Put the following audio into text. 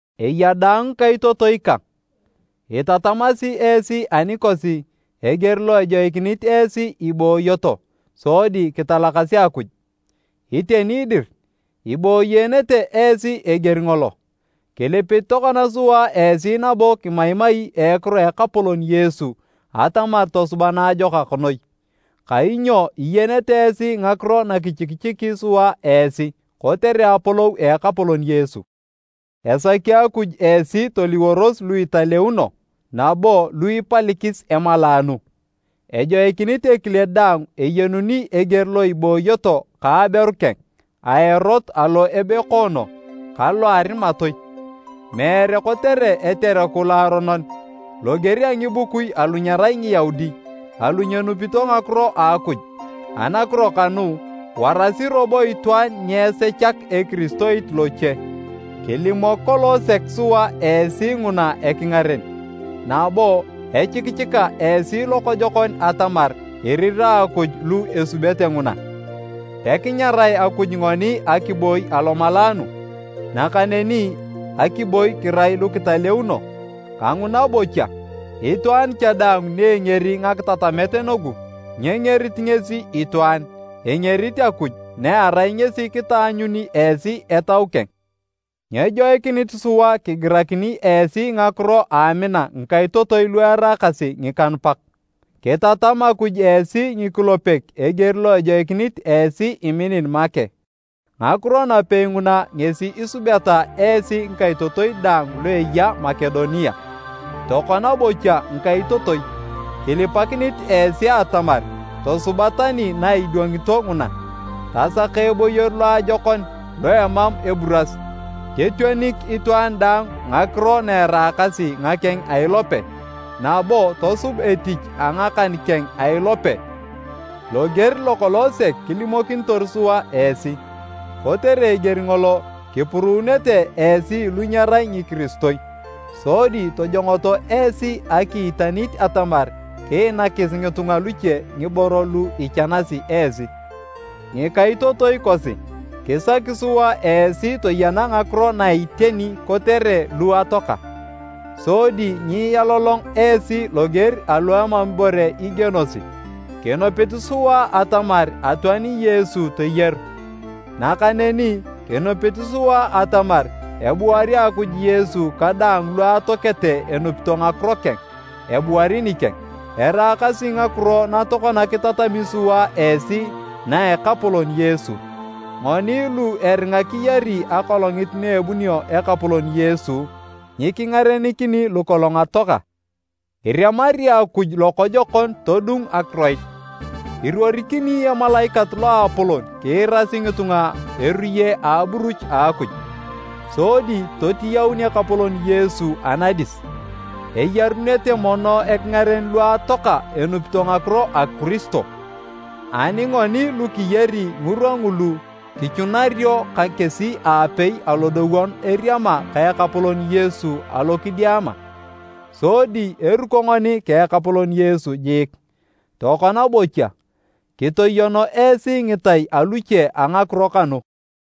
Eya daang ngikaitotoi kang, itatamasi esi anikosi eger lo ejoikinit esi ibooyoto sodi kitalakasi Akuj. Iteni dir, iboyeenete esi eger ngolo. Kilipit tokona sua esi nabo kimaimai a ekiro a Ekapolon Yesu atamar tosuba naajokak noi. Kainyo iyenete esi ngakiro nakichikichiki sua esi kotere apolou a Ekapolon Yesu. Esaki Akuj esi toliworos lu italeuno nabo lu ipalikis emalaanu. Ejoikinit ekile daang eyenuni eger lo iboyoto ka aberu keng a erot alo ebekoono ka lo a arimatoi, meere kotere etereku loaronon, loger a ngibukui alu nyerai Ngiyaudi alu nyenupito ngakiro a Akuj. Anakiro kanu, warasi robo itwaan nyeesechak ekiristoit loche kori nyiitoosor. Kilimok kolong sek sua esi nguna ekingaren, nabo echikichika esi lokojokon atamar irirae Akuj lu esubete nguna. Pekinyarae Akuj ngoni akiboi alomalaanu, nakaneni akiboi kirai lukitaleuno. Kanguna bocha, itwaan cha daang ni engeri ngakitatamet nugu nyengerit ngesi itwaan, engerit Akuj na erai ngesi kitaanyuni esi Etau keng. Nyejoikinit sua kigirakini esi ngakiro a amina ngikaitotoi lu eraakasi ngikanupak. Kitatam Akuj esi ngikulepek eger lo ejoikinit esi iminin make. Ngakiro napei nguna ngesi isubeta esi ngikaitotoi daang lu eya Makedonia. Tokona bocha ngikaitotoi, kilipakinit esi atamar tosuba tani na idwangito nguna. Tasaka eboyor loajokon lo emam eburas, totionik itwaan daang ngakiro na eraakasi ngakeng a ilope, nabo tosub etich a ngakan keng a ilope loger lokolong sek kilimokinitor sua esi. Kotere eger ngolo kipuruunete esi lu nyerai ngikiristoi sodi tojongoto esi akiitanit atamar kiinakis ngitunga luche ngiboro lu ichanasi esi. Ngikaitotoi kosi, kisaki sua esi toyena ngakiro na iteni kotere lu atoaka, sodi nyialolong esi loger alu emam ibore igienosi. Kinupit sua atamar atoani Yesu toyaru, nakaneni kinupit sua atamar ebuari Akuj Yesu ka daang lu atoakete enupito ngakiro keng, ebuari nikeng. Eraakasi ngakiro na tokona kitatami sua esi na a Ekapolon Yesu, ngoni lu eringa kiyari akolongit na ebunio Ekapolon Yesu, nyikingarenikini lukolong atoaka. Iremari Akuj lokojokon todung akiroit, iruorikini emalaikat loapolon kiirasi ngitunga erue a aburuch a Akuj. Sodi totiyaun Ekapolon Yesu anadis. Eyarunete mono ekingaren lu atoaka enupito ngakiro a Kiristo, ani ngoni lu kiyari ngirwa ngulu kichunario ka kesi aapei alodowon eriama ka Ekapolon Yesu alo kidiama. Sodi eruko ngoni ka Ekapolon Yesu jiik. Tokona bocha, kitoyono esi ngitai aluche a ngakiro kanu.